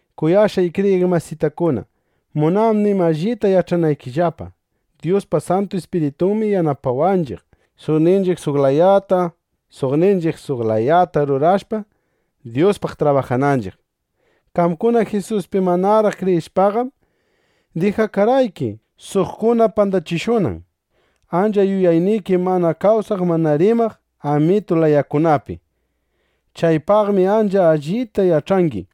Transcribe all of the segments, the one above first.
Kuyashqay kriyiq masitakuna, munanim allita yach'anaykillapa: Dyuspa Santu Ispiritunmi yanapawanchiq, suqninchiq suq layata, suqninchiq suq layata rurashpa, Dyuspaq trabajananchiq. Qamkuna Jisuspi manaraq kriyishpaqam, dijakarqayki, suqkuna pandachishunan, ancha yuyakunayki mana kawsaq mana rimaq amitu layakunapi. Chaypaqmi ancha allita yach'angi.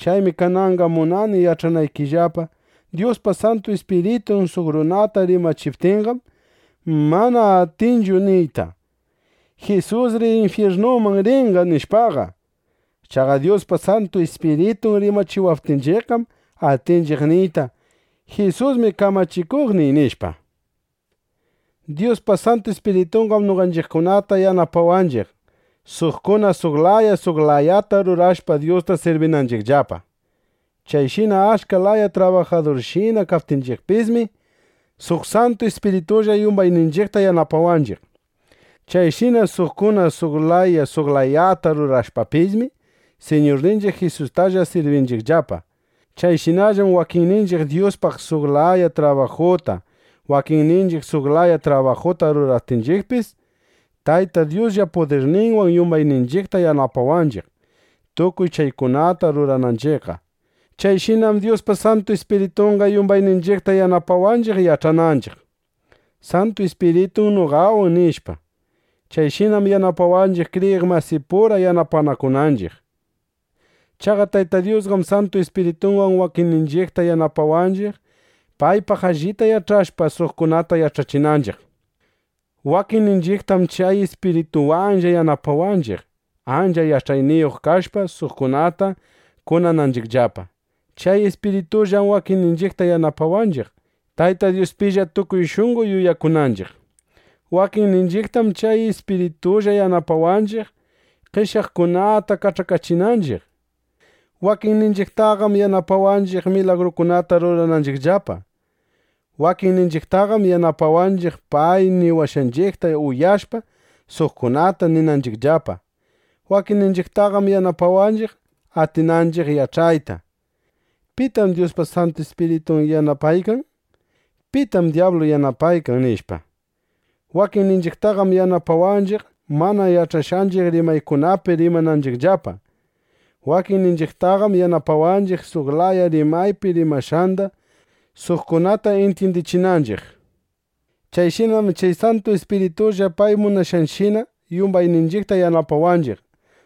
Chaymi kananqa munani yach'anaykillapa: Dyuspa Santu Ispiritun suq runata rimachiptinqam, mana atinchu niyta: “Jisusri infyirnuman rinqa”, nishpaqa. Chaqa Dyuspa Santu Ispiritun rimachiwaptinchiqqam atinchiq niyta: “Jisusmi kamachikuqniy”, nishpa. Dyuspa Santu Ispiritunqam noqanchiqkunata yanapawanchiq, suqkuna suq layata, suqkuna suq layata rurashpa, Dyusta sirbinanchiqllapa. Chayshina achka laya trabajadurshina kaptinchiqpismi, suq Santu Ispiritulla yumbayninchiqta yanapawanchiq. Chayshina suqkuna suq layata, suqkuna suq layata rurashpapismi, Siñurninchiq Jisustalla sirbinchiqllapa. Chayshinallam wakinninchiq Dyuspaq suq laya trabajuta, wakinninchiq suq laya trabajuta ruraptinchiqpis, Tayta Dyuslla pudirninwan yumbayninchiqta yanapawanchiq, tukuy chaykunata rurananchiqqa. Chayshinam Dyuspa Santu Ispiritunqa yumbayninchiqta yanapawanchiq, yach'ananchiq: “Santu Ispiritum noqawan”, nishpa. Chayshinam yanapawanchiq, kriyiq masipura yanapanakunanchiq. Chaqa Tayta Dyusqam Santu Ispiritunwan wakinninchiqta yanapawanchiq, paypaq allita yach'ashpa, suqkunata yach'achinanchiq. Wakinninchiqtam chay Ispiritunwanlla yanapawanchiq, ancha yach'ayniyuq kashpa, suqkunata kunananchiqllapa. Chay Ispiritunllam wakinninchiqta yanapawanchiq, Tayta Dyuspilla tukuy shunqo yuyakunanchiq. Wakinninchiqtam chay Ispiritunlla yanapawanchiq, qeshyaqkunata kach'akachinanchiq. Wakinninchiqtaqam yanapawanchiq, milagrukunata rurananchiqllapa. Wakinninchiqtaqam yanapawanchiq, pay niwashqanchiqta uyashpa, suqkunata ninanchiqllapa. Wakinninchiqtaqam yanapawanchiq, atinanchiq yach'ayta: ¿Pitam Dyuspa Santu Ispiritun yanapaykan? ¿Pitam dyablu yanapaykan? nishpa. Wakinninchiqtaqam yanapawanchiq, mana yach'ashqanchiq rimaykunapi rimananchiqllapa. Wakinninchiqtaqam yanapawanchiq, suq laya rimaypi rimashqanda, suqkunata intyindichinanchiq. Chayshinam chay Santu Ispiritulla pay munashqanshina yumbayninchiqta yanapawanchiq,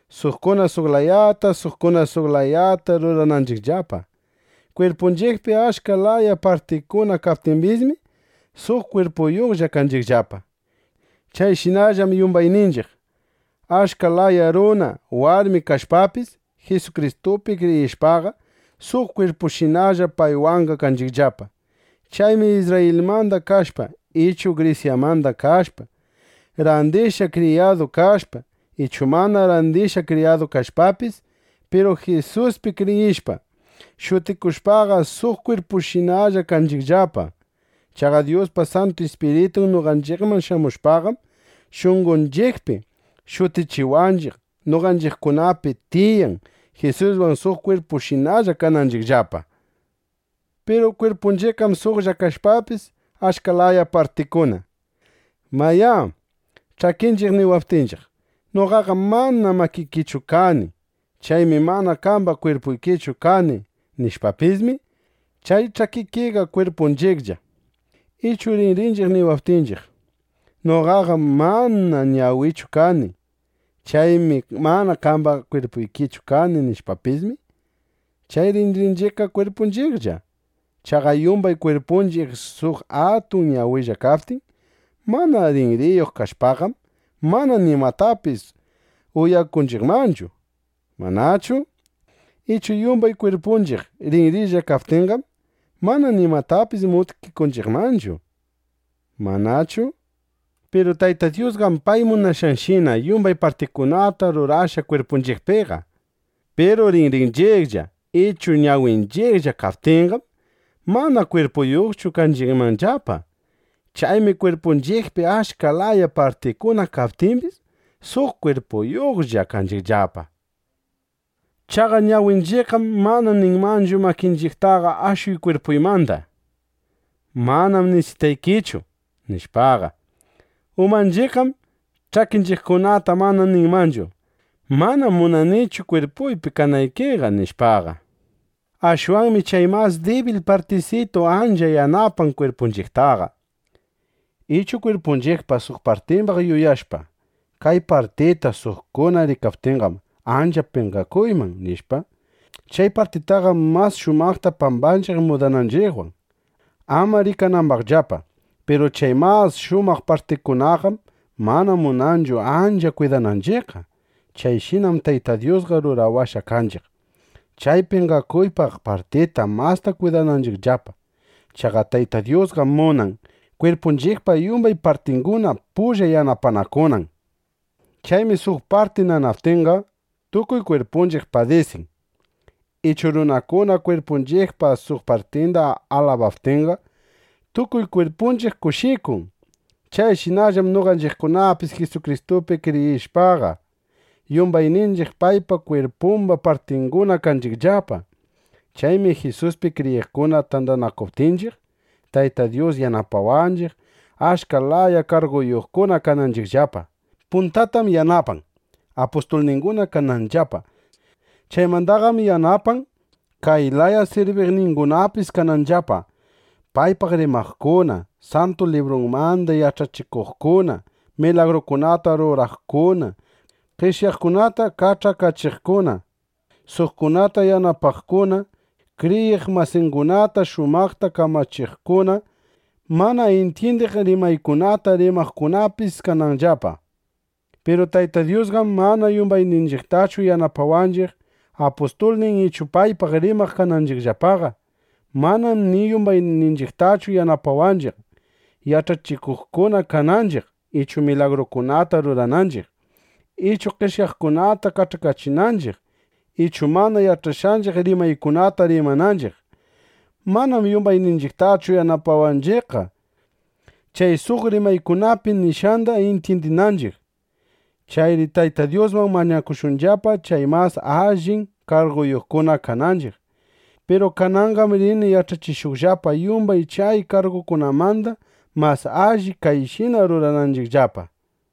suqkuna suq layata, suqkuna suq layata rurananchiqllapa. Kwirpunchiqpi achka laya partikuna kaptimbismi, suq kwirpuyuqlla kanchiqllapa. Chayshinallam yumbayninchiq, achka laya runa, warmi kashpapis, Jisukristupi kriyishpaqa, suq kwirpushinalla paywanqa kanchiqllapa. Chaymi Isrrayilmanda kashpa ichu Grisyamanda kashpa, randishqa kriyadu kashpa, ichu mana randishqa kriyadu kashpapis, piru Jisuspi kriyishpa, shutikushpaqa, suq kwirpushinalla kanchiqllapa. Chaqa Dyuspa Santu Ispiritun noqanchiqman shamushpaqam, shunqonchiqpi shutichiwaqninchiq, noqanchiqkunapi tiyan, Jisuswan suq kwirpushinalla kananchiqllapa. Piru kwirpunchiqqam suqlla kashpapis, achka laya partiyuqkuna. Mayá, ch'akinchiq niwaptinchiq: “Noqaqam mana makikichu kani. Chaymi mana qamba kwirpuykichu kani”, nishpapismi, chay ch'akinchiqqa kwirpunchiqlla. Ichu rinrinchiq niwaptinchiq: “Noqaqam mana ñawikichu kani. Chaymi mana qamba kwirpuykichu kani” nishpapismi, chay rinrinchiqqa kwirpunchiqlla. Chaqa yumbay kwirpunchiq suq atun ñawilla kaptin, mana rinriyuq kashpaqam, mana nimatapis uyakunchiqmanchu, ¿manachu? Ichu yumbay kwirpunchiq rinrilla kaptinqam, mana nimatapis mutkikunchiqmanchu, ¿manachu? Piru Tayta Dyusqam pay munashqanshina yumbay partikunata rurashqa kwirpunchiqpiqa. Piru rinrinchiqlla ichu ñawinchiqlla kaptinqam, mana kwirpuyuqchu kanchiqmanllapa. Chaymi kwirpunchiqpi achka laya partikuna kaptimbis, suq kwirpuyuqlla kanchiqllapa. Chaqa ñawinchiqqam mana ninmanchu makinchiqtaqa: “Ashuy kwirpuymanda. Manam nisitaykichu”, nishpaqa. Umanchiqqam ch'akinchiqkunata mana ninmanchu: “Manam munanichu kwirpuypi kanaykiqa”, nishpaqa. Ashwanmi chay mas dibil partisitu ancha yanapan kwirpunchiqtaqa. Ichu kwirpunchiqpa suq partimbaq yuyashpa: Kay partita suqkuna rikaptinqam, ancha penqakuyman, nishpa, chay partitaqam mas shumaqta pambanchiq mudananchiqwan, ama rikanambaqllapa. Piru chay mas shumaq partinchiqkunaqam mana munanchu ancha kwidananchiqqa. Chayshinam Tayta Dyusqa rurawashqa kanchiq, chay penqakuypaq partita masta kwidananchiqllapa. Chaqa Tayta Dyusqam munan, kwirpunchiqpa yumbay partinguna pulla yanapanakunan. Chaymi suq parti nanaptinqa, tukuy kwirpunchiq padisin. Ichu runakuna kwirpunchiqpa suq partinda alabaptinqa, tukuy kwirpunchiq kushikun. Chayshinallam noqanchiqkunapis Jisukristupi kriyishpaqa, yumbayninchiq paypa kwirpumba partinguna kanchiqllapa. Chaymi Jisuspi kriyiqkuna tandanakuptinchiq, Tayta Dyus yanapawanchiq, achka laya karguyuqkuna kananchiqllapa. Puntatam yanapan, apustulninguna kananllapa. Chaymandaqam yanapan, kay laya sirbikuqningunapis kananllapa: paypaq rimaqkuna, Santu Librunmanda yach'achikuqkuna, milagrukunata ruraqkuna, qeshyaqkunata kach'akachiqkuna, suqkunata yanapaqkuna, kriyiq masingunata shumaqta kamachiqkuna, mana intyindiq rimaykunata rimaqkunapis kananllapa. Piru Tayta Dyusqam mana yumbayninchiqtachu yanapawanchiq, apustulnin ichu paypaq rimaq kananchiqllapaqa. Manam ni yumbayninchiqtachu yanapawanchiq, yach'achikuqkuna kananchiq ichu milagrukunata rurananchiq, ichu qeshyaqkunata kach'akachinanchiq, ichu mana yach'ashqanchiq rimaykunata rimananchiq. Manam yumbayninchiqtachu yanapawanchiqqa, chay suq rimaykunapi nishqanda intyindichinanchiq. Chayri Tayta Dyusman mañakushunllapa, chay mas allin karguyuqkuna kananchiq. Piru kananqam rini yach'achishuqllapa, yumbay chay kargukunamanda mas alli kayshina rurananchiqllapa.